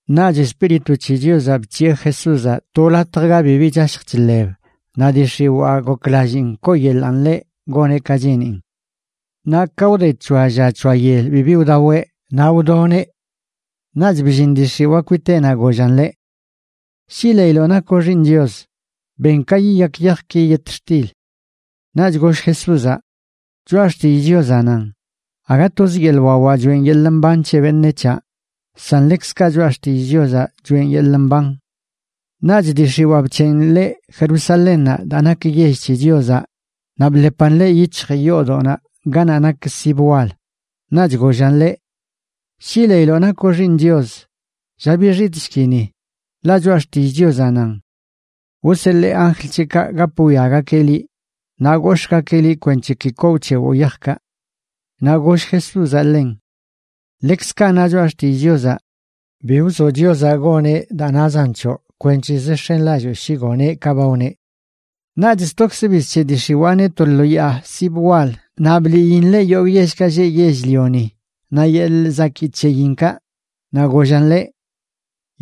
Naꞌch Espíritu c̱he Chiozaꞌ bc̱hiꞌe Jesúzaꞌ to latj ga bibi chashj chḻeb naꞌ dii x̱iwaa goklalliin kooyeḻaꞌn ḻeꞌ goneꞌ ka cheenin. Naꞌ ka wde c̱hoa lla c̱hoa yel bibi wdaweꞌ, naꞌ wdoneꞌ. Naꞌch bllin dii x̱iwaa kwiteꞌnaꞌ gollan ḻeꞌ: ―Shi leiloꞌ nakoꞌ Xiiṉ Chios, ben ka yiyak yajki yetxtil. Naꞌch goll Jesúzaꞌ: ―Choꞌa xtillꞌ Chiozaꞌ nan: “Aga toz yeḻꞌ wawaꞌ choeꞌn yeḻꞌ mban c̱he beṉec̱haꞌ, san ḻekzkaꞌ Choꞌa Xtillꞌ Chiozaꞌ choeꞌn yeḻꞌ mban.” Naꞌch dii x̱iwaa bc̱heꞌn ḻeꞌ Jerusalénnaꞌ daa nak yell c̱he Chiozaꞌ naꞌ bḻepan ḻeꞌ yic̱hj yoodoꞌnaꞌ ganaꞌ nak sib wal. Naꞌch gollan ḻeꞌ: ―Shi leiloꞌ nakoꞌ Xiiṉ Chios, lla bixitꞌshki ni. Ḻaꞌ Choꞌa Xtillꞌ Chiozaꞌ nan: Wseḻee anjl c̱heꞌkaꞌ gap wwiagakeꞌ liꞌ, naꞌ gox̱ꞌgakeꞌ liꞌ kwenc̱he ki koo wc̱hewoꞌ yajkaꞌ. Naꞌ goll Jesúzaꞌ ḻen: ―Ḻekzkaꞌ na Choꞌa Xtillꞌ Chiozaꞌ: “Bi wzoꞌ Chiozaꞌ goneꞌ daa nazan c̱hoꞌ kwenc̱hezə x̱enlalloo shi goneꞌ ka ba wneꞌ.” Naꞌch stokzə bizc̱heꞌ dii x̱iwaaneꞌ to lo yaa sib wal naꞌ bliin ḻeꞌ yogꞌ yellkaꞌ lleꞌ yell-lioni naꞌ yeḻꞌ zakii c̱heyinkaꞌ. Naꞌ gollan ḻeꞌ: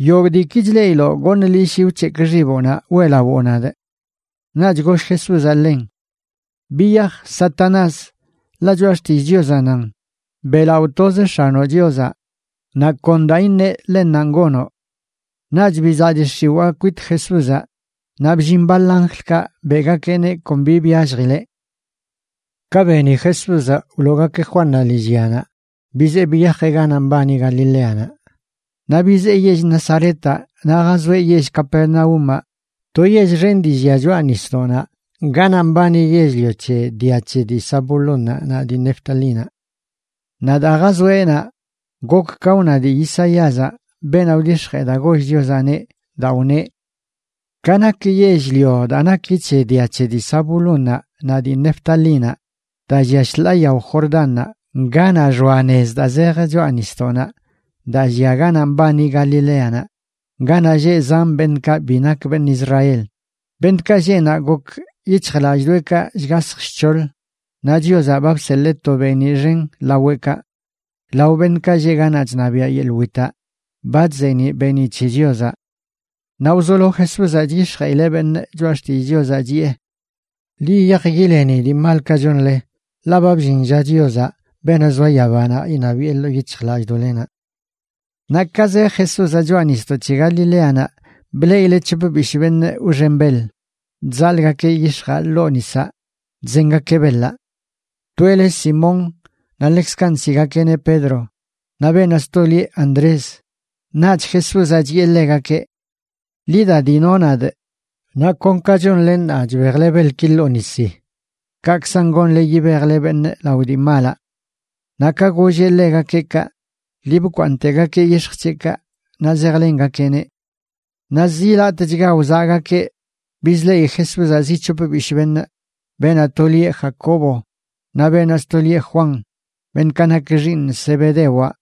―Yogꞌ diiki chleꞌiloꞌ goṉꞌ liꞌ shi wc̱hekꞌ xiboꞌnaꞌ weꞌlawoo nadꞌ. Naꞌch goll Jesúzaꞌ ḻen: ―Biyaj, Satanás, ḻaꞌ Choꞌa Xtillꞌ Chiozaꞌ nan: “Beꞌlaꞌo toz X̱anoꞌ Chiozaꞌ naꞌ kon daa iṉeꞌ, ḻennanꞌ gonoꞌ.” Naꞌch bizaꞌ dii x̱iwaa kwit Jesúzaꞌ naꞌ bllin baḻ anjlkaꞌ beꞌgakeꞌneꞌ kon bi byalljileꞌ. Ka beni Jesúzaꞌ wloogakeꞌ Juannaꞌ lillyanaꞌ, bizee biyajeꞌ ganaꞌ mbani Galileanaꞌ. Naꞌ bizee yell Nazaretaꞌ naꞌ jazoeꞌ yell Capernaúmaꞌ, to yell xen dii llia choꞌa nisdoꞌnaꞌ ganaꞌ mbani yell-lio c̱he dia c̱he dii Zabulónnaꞌ naꞌ dii Neftalínaꞌ. Naꞌ daa jazoeꞌ naꞌ, gok ka wna dii Isaíazaꞌ, beenaꞌ wdix̱jee daa goll Chiozaꞌneꞌ, daa wneꞌ: Ka nak yell-lio daa naki c̱he dia c̱he dii Zabulónnaꞌ naꞌ dii Neftalínaꞌ, daa llia shḻaa yao Jordánnaꞌ, ganaꞌ xoa nez daa zej choꞌa nisdoꞌnaꞌ daa llia ganaꞌ mbani Galileanaꞌ, ganaꞌ lleꞌ zan beṉꞌkaꞌ bi nak beṉꞌ Israel, beṉꞌkaꞌ lleꞌ naꞌ gok yic̱hjlallꞌdoꞌekaꞌ shgasj shc̱hoḻ, naꞌ Chiozaꞌ ba bseḻee to beeniꞌ xen laweꞌkaꞌ. Lao beṉꞌkaꞌ lleꞌ ganaꞌ chṉabiaꞌ yeḻꞌ witaꞌ ba chzeeniꞌ beeniꞌ c̱he Chiozaꞌ. Naꞌ wzolo Jesúzaꞌ chyix̱jeꞌileꞌ beṉꞌ choꞌa xtillꞌ Chiozaꞌ, chiꞌe: ―Ḻi yiyaj yileni dii malkaꞌ chonle, ḻaꞌ ba bllin lla Chiozaꞌ, beenaꞌ zoa yabanaꞌ, iṉabiꞌe ḻoo yic̱hjlallꞌdoꞌlenaꞌ. Naꞌ ka zej Jesúzaꞌ choꞌa nisdoꞌ c̱he Galileanaꞌ bleꞌileꞌ c̱hop bishꞌ beṉꞌ wxen beḻ chzaḻꞌgakeꞌ yix̱jaꞌ ḻoo nisaꞌ chzengakeꞌ beḻaꞌ. Toeꞌ le Simón naꞌ ḻekzkaꞌ nsiꞌgakeꞌneꞌ Pedro, naꞌ beenaꞌ sto lieꞌ Andrés. Naꞌch Jesúzaꞌ chiꞌe ḻegakeꞌ: ―Ḻi da, dino nadꞌ, naꞌ kon ka chonle ṉaa chbejle beḻki ḻoo nisi, kaꞌkzan gonle yibejle beṉꞌ lao dii malaꞌ. Naꞌ ka golleꞌ ḻegakeꞌ kaꞌ, lii bkwaaṉꞌtegakeꞌ yix̱j c̱heꞌkaꞌ naꞌ zejlengakeꞌneꞌ. Naꞌ zi latꞌchga wzaꞌgakeꞌ bizleꞌi Jesúzaꞌ zi c̱hop bishꞌ beṉꞌ, beenaꞌ to lieꞌ Jacobo naꞌ beenaꞌ sto lieꞌ Juan, beṉꞌkaꞌ nak xiiṉ Zebedewaꞌ,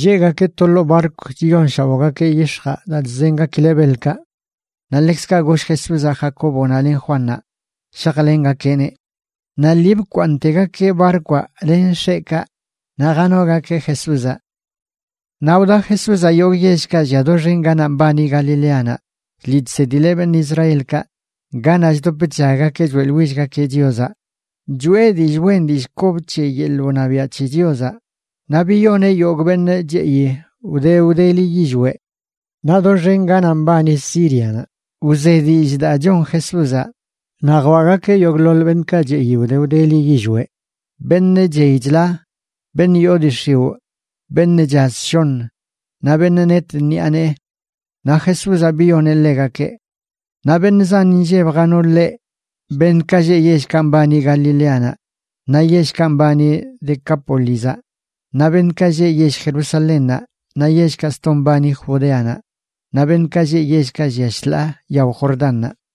lleꞌgakeꞌ to ḻoo barkw chiyonshaoꞌgakeꞌ yix̱jaꞌ daa chzengakileꞌ beḻkaꞌ. Naꞌ ḻekzkaꞌ goll Jesúzaꞌ Jacóbonaꞌ len Juannaꞌ shajlengakeꞌneꞌ. Naꞌ lii bkwaaṉꞌtegakeꞌ barkwaꞌ len x̱eꞌkaꞌ naꞌ janogakeꞌ Jesúzaꞌ. Naꞌ wda Jesúzaꞌ yogꞌ yellkaꞌ llia doxen ganaꞌ mbani Galileanaꞌ, chliꞌ chsedileꞌ beṉꞌ Israelkaꞌ ganaꞌ chdop chllaggakeꞌ choeꞌḻwillgakeꞌ Chiozaꞌ, choꞌe dillꞌ wen dillꞌ kob c̱he yeḻꞌ wṉabiaꞌ c̱he Chiozaꞌ, naꞌ biyoneꞌ yogꞌ beṉꞌ cheꞌi wde wdeli yillweꞌ. Naꞌ doxen ganaꞌ mbani Sírianaꞌ wze dillꞌ daa chon Jesúzaꞌ, naꞌ jwaꞌgakeꞌ yogꞌḻoḻ beṉꞌkaꞌ cheꞌi wde wdeli yillweꞌ, beṉꞌ chey chla, beṉꞌ yoo dii x̱iwꞌ, beṉꞌ chaz shoṉ, naꞌ beṉꞌ net ṉiꞌa nee. Naꞌ Jesúzaꞌ biyoneꞌ ḻegakeꞌ. Naꞌ beṉꞌ zan inlleb jano ḻeꞌ, beṉꞌkaꞌ lleꞌ yellkaꞌ mbani Galileanaꞌ naꞌ yellkaꞌ mbani Decápolizaꞌ, naꞌ beṉꞌkaꞌ lleꞌ yell Jerusalénnaꞌ naꞌ yellkaꞌ sto mbani Judeanaꞌ, naꞌ beṉꞌkaꞌ lleꞌ yellkaꞌ llia shḻaa yao Jordánnaꞌ.